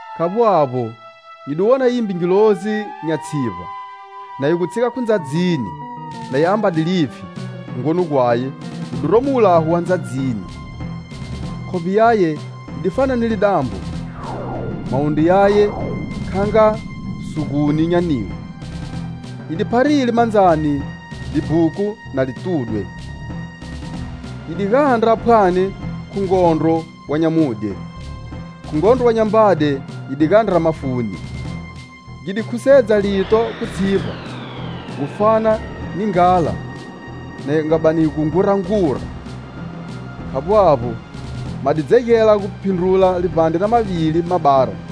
Khavbo avbo, nyi di wona yimbe ngilozi nya tshivba na yi gu tshiga khu ndzadzini, na yi ambade lipfhi; hungoni gwaye wu diromo wulaho wa ndzadzini, khovbe yaye yi di fana ni lidambo, mawundru yaye kha nga siguni nya nilo. Yi di pharile mandzani libhuku na li tudwe. Yi di gandra phwani khu ngondro wa nyamudye, khu ngondro wa nyambade yi gu gandra mafuni, gi di khusedza lito khu tshivba gu fana ni nghala ya gu bani yi ngurangura. Khavbo avbo, ma di dzegela gu phindrula livbandre na mavili mabara.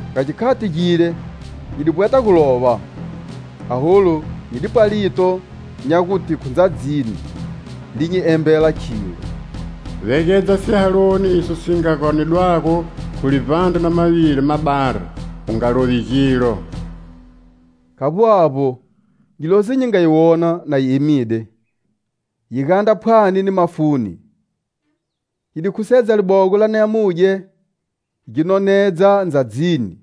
Ga gikhati gile, nyi di vbweta gu lova, aholu nyi dipwa lito nya gute khu ndzadzini li nyi embela khilo: "Vegedza sihaloni iso si nga ganedwago khu livbandre na mavili mabara. U nga lovi gilo." Khavbo avbo, ngilozi nyi nga yi wona na yi emide yi gandra phwani ni mafuni, yi di khusedza libogo la nyamudye gi nonedza ndzadzini,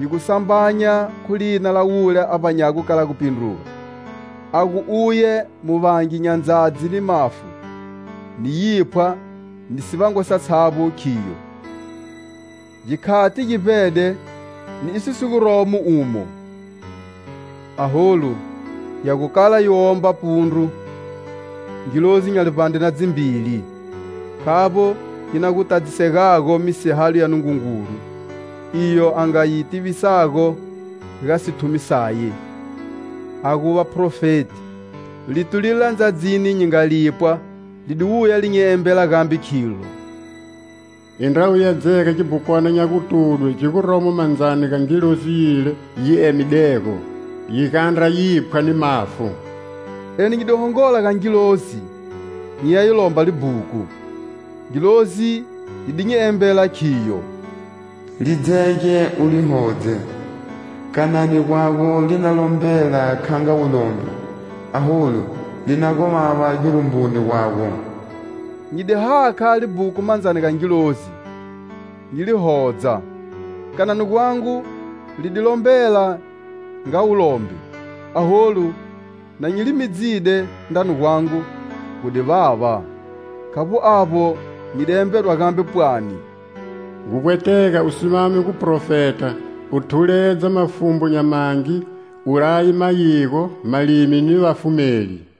yi gu sambanya khu lina la wule a vbanyago kala gupindruga, a gu uye muvangi nya ndzadzi ni mafu ni yiphwa ni sivangwa satshavbo, khiyo: "Gikhati gi vbede ni iso si guromo umo! Aholu ya gu kala yi gu womba pundru ngilozi nya livbandre na dzivili, khavbo yi na gu tadzisegago misihalo ya Nungungulu, iyo a nga yi tivisago ga sithumi saye, a gu vaphrofeti." Lito lile la ndzadzini nyi nga lipwa, li di wuya li nyi embela gambe khilo: "Indra uya dzega gibhukwana nya gutudwe gi guromo mandzani ga ngilozi yile yi emidego, yi gandra yiphwa ni mafu." Eni nyi di hongola ga ngilozi nyi ya yi lomba libhuku. Ngilozi yi di nyi embela khiyo: "Li dzege u li hodze; kanani gwago li na lombela kha nga wulombe, aholu li na gu vava girumbuni gwago." Nyi di hakha libhuku mandzani ga ngilozi nyi li hodza, kanani gwangu li di lombela nga wulombe, aholu, na nyi li midzide, ndrani gwangu gu di vava. Khavbo avbo, nyi di embedwa gambe, pwani: "Gu vbwetega u simame guphrofeta, u thuledza mafumbu nya mangi, u laye mayigo, malimi ni vafumeli."